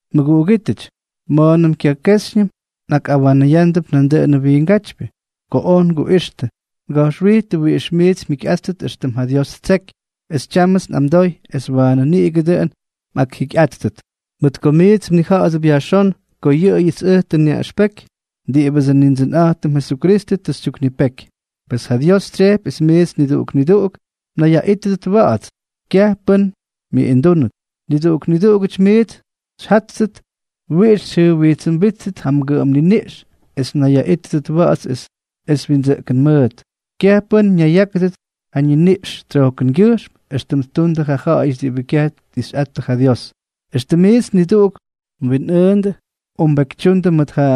Mʉguꞌugítʉty, ma̱a̱nʉm kyakejxyñʉm nꞌakꞌawanʉyándʉp nandʉꞌʉnʉ wiingátypyʉ. Ko oj nguꞌixtʉ, nga̱jxwijtʉ wiꞌix miits mjikyꞌáttʉt éxtʉm ja Dios ttseky, es tyámʉts nꞌamdoy es waanʉ niꞌigʉ dʉꞌʉn mꞌakjikyꞌáttʉt. Mʉt ko miits mnija̱ꞌa̱dʉp yajxón ko yʉꞌʉyʉts ʉj tʉ nyaꞌʉxpeky diꞌibʉdsʉ Nindsʉnꞌa̱jtʉm Jesukristʉ tʉ xytyuknipeky. Pes ja Dios tsyejpy es miits niduꞌuk niduꞌuk mnayyaꞌítʉdʉt wa̱ꞌa̱ts; kyaj pʉ́n myʉꞌindúnʉt. Niduꞌuk niduꞌugʉty miits xyjáttʉt wiꞌix xyjʉjwijtsʉmbíttʉt ja mgʉꞌʉm niniꞌx es mnayyaꞌítʉdʉt wa̱ꞌa̱ts es windsʉꞌkʉn mʉʉt, kyaj pʉ́n ñayyákʉdʉt ja ñiniꞌx tsyojkʉngyʉjxm, éxtʉm ttundʉ yʉ ja̱ꞌa̱yʉty diꞌibʉ kyaj tꞌixꞌattʉ ja Dios. Exkʉm miits niduꞌuk mwinꞌʉʉndʉ o mbekytyundʉ mʉt ja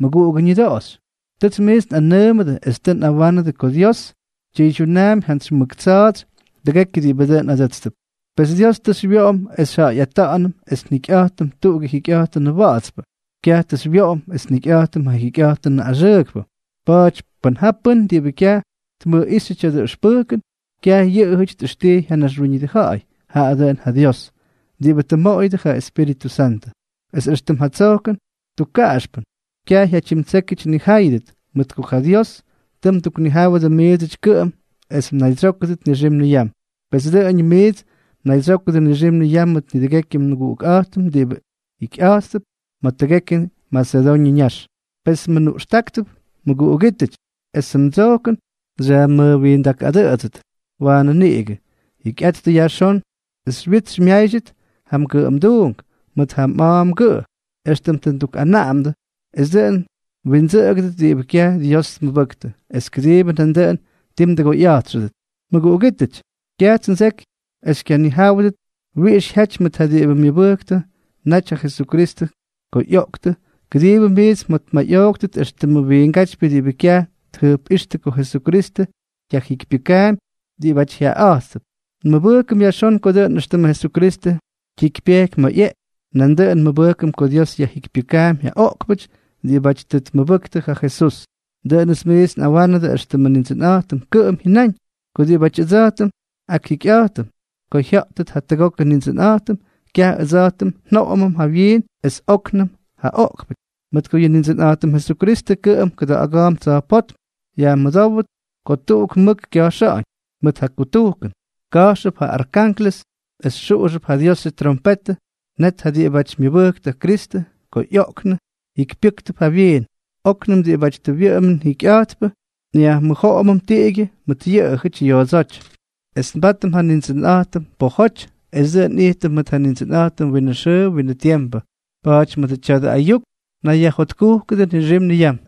mmʉguꞌugʉ ñʉdoꞌoxy. Tʉts miits nꞌanʉʉmʉdʉ es tʉ nꞌawánʉdʉ ko Dios tyʉydyunaampy jantsy mʉk tsa̱a̱tsy tʉgekyʉ diꞌibʉ dʉꞌʉn adʉ́tstʉp. Pes Dios tʉ xywyoꞌom es xyjaꞌayꞌata̱ꞌa̱nʉm es njikyꞌa̱jtʉm tuꞌugʉ jikyꞌa̱jtʉnʉ wa̱ꞌa̱tspʉ; kyaj tʉ xywyoꞌom es njikyꞌa̱jtʉm ja jikyꞌa̱jtʉnʉ axʉʉkpʉ. Pa̱a̱ty pʉn ja pʉ́n diꞌibʉ kyaj tmʉjꞌíxyʉ tya̱dʉ ʉxpʉjkʉn, kyaj yʉꞌʉjʉty tꞌʉxtijy ja naxwíñʉdʉ ja̱ꞌa̱y, jaꞌa dʉꞌʉn ja Dios, diꞌibʉ tʉ mmoꞌoyʉdʉ ja ꞌyEspíritʉ Santʉ. Es éxtʉm ja tsojkʉn tukkaꞌaxpʉn, kyaj jyatyimtsékyʉty nnijáyʉdʉt, mʉt ko ja Dios tʉ mduknijáwʉdʉ miidsʉty kʉꞌʉm es mnaydsyókʉdʉt nixim niyam. Pes dʉꞌʉñʉm miits mnaydsyókʉdʉ nixim niyam mʉt nidʉgekyʉ nmʉguꞌukꞌa̱jtʉm diꞌibʉ jikyꞌa̱jttʉp ma̱ tʉgekyʉ Masedoñʉ ñax. Per nmʉnuꞌxtáktʉp, mʉguꞌugítʉty, esʉ mdsojkʉn xyajmʉjwindakꞌadʉꞌʉdsʉt waanʉ niꞌigʉ. Jikyꞌattʉ yajxón es xywyits xymyáydyʉt ja mgʉꞌʉmduunk mʉt ja mꞌa̱a̱ mgʉꞌʉ, éxtʉm tʉ ndukꞌanaꞌamdʉ, es dʉꞌʉn mwindsʉꞌʉgʉdʉt diꞌibʉ kyaj Dios tmʉbʉktʉ, es kʉdiibʉ nandʉꞌʉn ti mdʉgoyꞌa̱jtxʉdʉt. Mʉguꞌugítʉty, kyajts ndseky es kyaj xyñijáwʉdʉt wiꞌix jyaty mʉt ja diꞌibʉ myʉbʉjktʉbʉ naty ja Jesukristʉ ko ꞌyoꞌktʉ, kʉdiibʉ miits mjotmayꞌooktʉt éxtʉmʉ wiingátypyʉ diꞌibʉ kyaj tjʉjpꞌíxtʉ ko Jesukristʉ yajjikypyʉkaampy diꞌibáty jyaꞌaꞌa̱jttʉp. Nmʉbʉjkʉm yajxón ko dʉꞌʉn éxtʉmʉ Jesukristʉ jyikypyejky ma̱ ꞌyeꞌky, nandʉꞌʉn nmʉbʉjkʉm ko Dios yajjikypyʉkaampy ja oꞌkpʉty diꞌibáty tʉ tmʉbʉktʉ ja Jesús. Dʉꞌʉnʉts miits nꞌawánʉdʉ éxtʉmʉ Nindsʉnꞌa̱jtʉm kʉꞌʉm jyʉnáñ, ko diꞌibáty ʉdsa̱jtʉm akjikyꞌa̱jtʉm ko jya̱ꞌtʉt jatʉgokʉ Nindsʉnꞌa̱jtʉm, kyaj ʉdsa̱jtʉm njoꞌomʉm jawyiin es óknʉm ja oꞌkpʉty. Mʉt ko yʉ Nindsʉnꞌa̱jtʉm Jesukristʉ kʉꞌʉm kʉda̱ꞌa̱ga̱a̱mp tsa̱jpótm, yajmʉdówʉp ko tuꞌuk mʉk kya̱jxa̱ꞌa̱ñ mʉt ja kutujkʉn, ka̱jxʉp ja arkanklʉs es xuꞌuxʉp ja Diosʉ tyrompetʉ, net ja diꞌibáty myʉbʉjktʉ ja Kristʉ ko ꞌyoꞌktʉ, jikypyʉ́ktʉp jawyiin; óknʉm diꞌibáty tʉ nwʉꞌʉmʉm jikyꞌa̱jtpʉ nyajmʉjoꞌomʉm tiꞌigyʉ mʉt yʉꞌʉjʉty yoodsóty, es nbátʉm ja Nindsʉnꞌa̱jtʉm pojoty, es dʉꞌʉn nꞌijtʉm mʉt ja Nindsʉnꞌa̱jtʉm winʉ xʉʉ winʉ tiempʉ. Pa̱a̱ty mʉdʉ tya̱dʉ ayuk nayyajjotkujkʉdʉ nixim niyam.